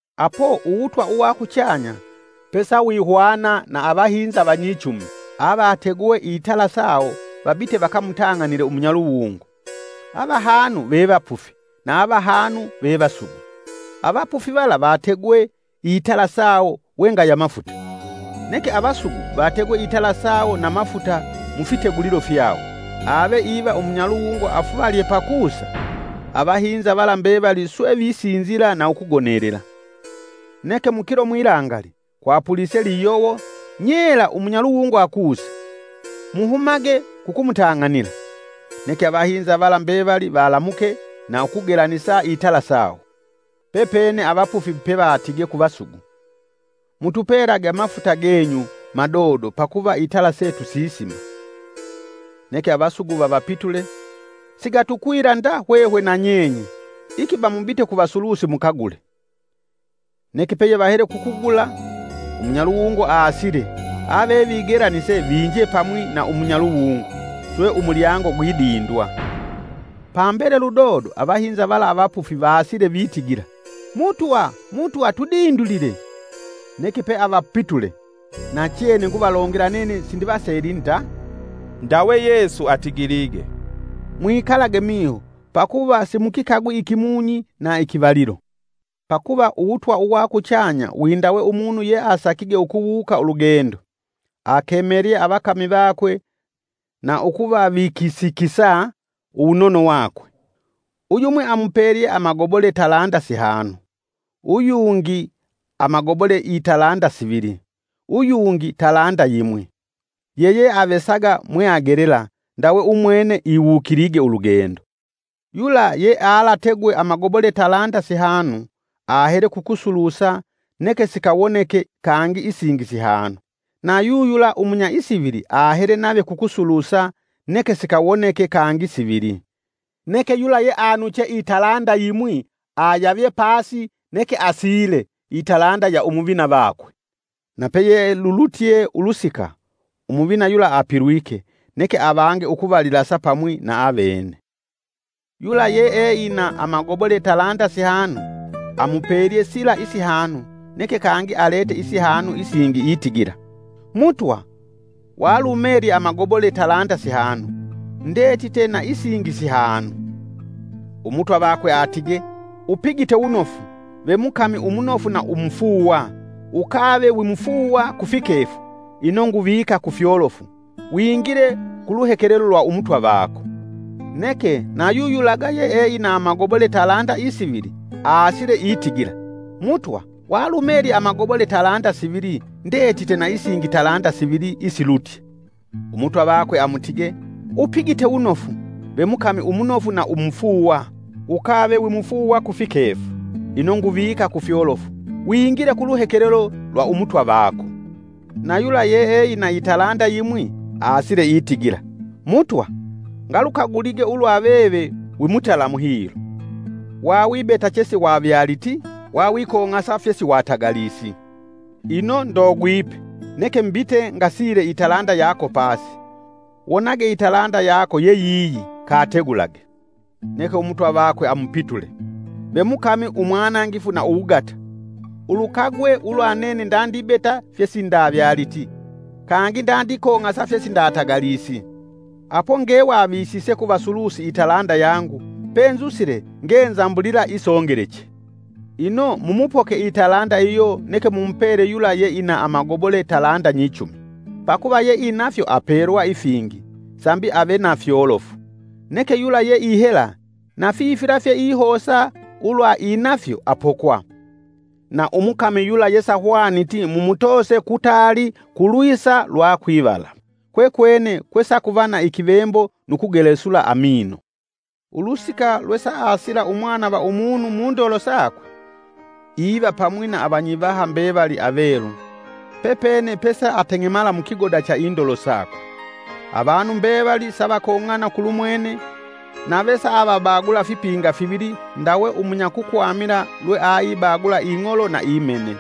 “Apo Uwutwa uwa kuchanya pesawihwana na avahinza vanyichumi avategwee itala sawo vabite vakamutang'anile umunyaluwungo. Avahanu vevapufi na avahanu vevasugu. Avapufi vala vategwe itala sawo wengaya mafuta. Neke avasugu vategwe itala sawo na mafuta mufitegulilo fyawo. Ave iva umunyaluwungo afuvalye pakusa, avahinza vala mbevali swe visinzila na ukugonelela. “Neke mukilo mwilangali kwapulise liyowo, nyela umunyaluwungo akusa; ‘Muhumage kukumutang'anila.’ Neke avahinza vala mbevali valamuke na ukugelanisa itala sawo. Pepene avapufi pevatige ku vasugu: ‘Mutupelage amafuta genyu madodo pakuva itala setu sisima.’ Neke avasugu vavapitule, ‘Sigatukwila nda hwehwe na nyenye! Ikiba mubite ku vasulusi mukagule!’ Neke peyevahele kukugula, umunyaluwungo aasile, avevigelanise vinje pamwi na umunyaluwungo; swe umulyango gwidindwa. Pambele ludodo avahinza vala avapufi vaasile vitigila, ‘Mutwa, Mutwa tudindulile!’ Neke peavapitule, ‘Nachene nguvalongela, nene sindivaseli nda.’” Ndawe Yesu atigilige, “Mwikalage miho pakuva simukikagwi ikimunyi na ikivalilo.” Pakuva uwutwa uwa kuchanya windawe umunu yeasakige ukuwuuka ulugendo, akemelye avakami vakwe na ukuvavikisikisa uwunono wakwe. Uyumwi amupelye amagobole talanda sihanu, uyungi amagobole italanda sivili, uyungi talanda yimwi, yeyeavesaga mweagelela, ndawe umwene iwukilige ulugendo. Yula yealategwe amagobole talanda sihanu, ahele kukusulusa neke sikawoneka kangi isingi sihanu. Na yuyula umunya isivili ahele nave kukusulusa neke sikawoneka kangi sivili. Neke yula yeanuche italanda yimwi ayavye pasi neke asiile italanda ya umuvina vakwe. “Na peyelulutye ulusika umuvina yula apilwike neke avange ukuvalilasa pamwi na avene. Yula yeeina amagobole talanda sihanu amupelye sila isihanu neke kangi alete isihanu isingi itigila; ‘Mutwa walumelye amagobole talanda sihanu ndetite na isingi sihanu.’ Umutwa vakwe atige: ‘Upigite wunofu, ve mukami umunofu na umufuuwa, ukave wimufuuwa kufikefu ino nguvika kufyolofu. Wingile ku luhekelelo lwa umutwa vako.’ Neke na yuyulaga yeeina amagobole talanda isivili aasile itigila: ‘Mutwa walumelye amagobole talanda sivili ndetite na isingi talanda sivili isilutye.’ Umutwa vakwe amutige: ‘Upigite wunofu, ve mukami umunofu na umufuuwa, ukave wimufuuwa kufikefu, ino nguvika kufyolofu. Wingile ku luhekelelo lwa umutwa vako.’ Na yula yeeina italanda yimwi aasile itigila: ‘Mutwa ngalukagulige ulwa veve wimutalamu hilo, wawibeta chesiwavyaliti, wawikong'asa fyesiwatagalisi. Ino ndogwipe, neke mbite ngasile italanda yako pasi. Wonage italanda yako yeyiyi kategulage.’ Neke umutwa vakwe amupitule: ‘Ve mukami umwanangifu na uwugata! Ulukagwe ulwa nene ndandibeta fyesindavyaliti kangi ndandikong'asa fyesindatagalisi. Apo ngewavisise ku vasulusi italanda yangu penzusile ngenzambulila isongeleche! Ino mumupoke italanda iyo neke mumupele yula yeina amagobole talanda nyichumi. Pakuva yeinafyo apelwa ifingi sambi ave na fyolofu. Neke yula yeihela na fifila fyeihosa ulwa inafyo apokwa. Na umukami yula yesahwaniti mumutoose kutaali kulwisa lwa kwivala, kwekwene kwesakuva na ikivembo nu kugelesula amino.’ “Ulusika lwe saasila Umwana va Umunu mundolo sakwe, iva pamwi na avanyivaha mbevali avelu, pepene pesaateng'emala mukigoda cha indolo sakwe. Avanu mbevali savakong'ana kulumwene, nave saavabagula fipinga fivili ndawe umunyakukwamila lweaibagula ing'olo na imene.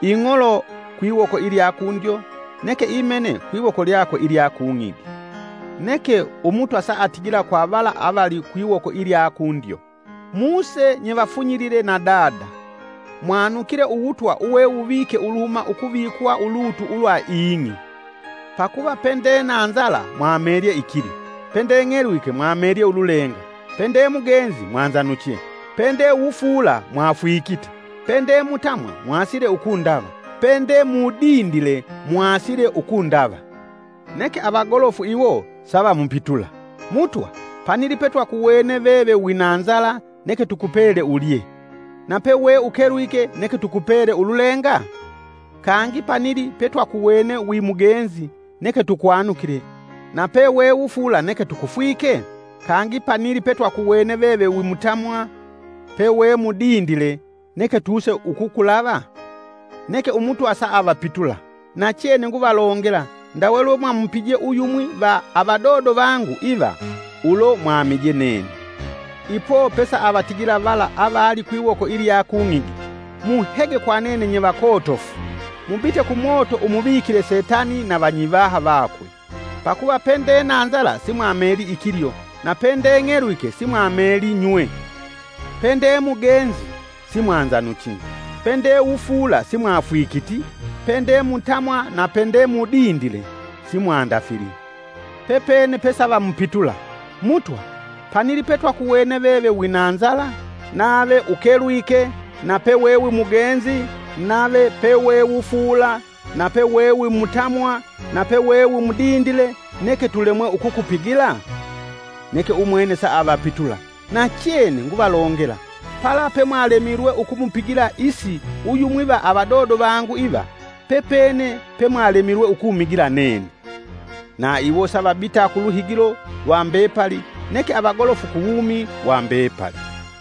Ing'olo kwiwoko ilya kundyo, neke imene kwiwoko lyakwe ilya kung'igi. Neke umutwa saatigila kwa vala avali kwiwoko ilya kundyo: ‘Muse nyevafunyilile na Dada; mwanukile Uwutwa uwewuvike uluhuma ukuvikwa ulutu ulwa ing'i. Pakuva pende na nzala mwamelye ikilyo; pende ng'elwike mwamelye ululenga; pende mugenzi mwanzanuche; pende wufuula mwafwikite; pende mutamwa mwaasile ukundava; pende mudindile mwaasile ukundava.’ Neke avagolofu iwo savamupitula, ‘Mutwa panili petwakuwene veve wina nzala neke tukupele ulye, na peweukelwike neke tukupele ululenga? Kangi panili petwakuwene wimugenzi neke tukwanukile na pe wewufuula neke tukufwike?’ Kangi panili petwakuwene veve wimutamwa pe wemudindile neke tuuse ukukulava? Neke Umutwa saavapitula: ‘Nachene nguvalongela ndawe lwe mwamupije uyumwi va avadodo vangu iva ulo mwamije nene.’” “Ipo pe saavatigila vala avali kwiwoko ilya kung'igi: ‘Muhege kwa nene nyevakotofu! Mubite kumoto umuvikile setani na vanyivaha vakwe. Pakuva pende na nzala simwamelii ikilyo na pende ng'elwike simwamelii nywe. Pende mugenzi simwanzanuchi; pende wufuula simwafwikiti, pende mutamwa na pende mudindile simwandafili.’ Pepene pe savamupitula: ‘Mutwa panili pe twakuwene veve winanzala nave ukelwike na pe wewimugenzi nave pewewufuula nape wewimutamwa nape we wimudindile neke tulemwe ukukupigila?’ Neke umwene saavapitula: ‘Nachene nguvalongela, pala pemwalemilwe ukumupigila is uyumwi va avadodo vangu iva, pepene pemwalemilwe ukumigila nene.’ Na iwo savabita kuluhigilo lwa mbepali neke avagolofu ku wumi wa mbepali.”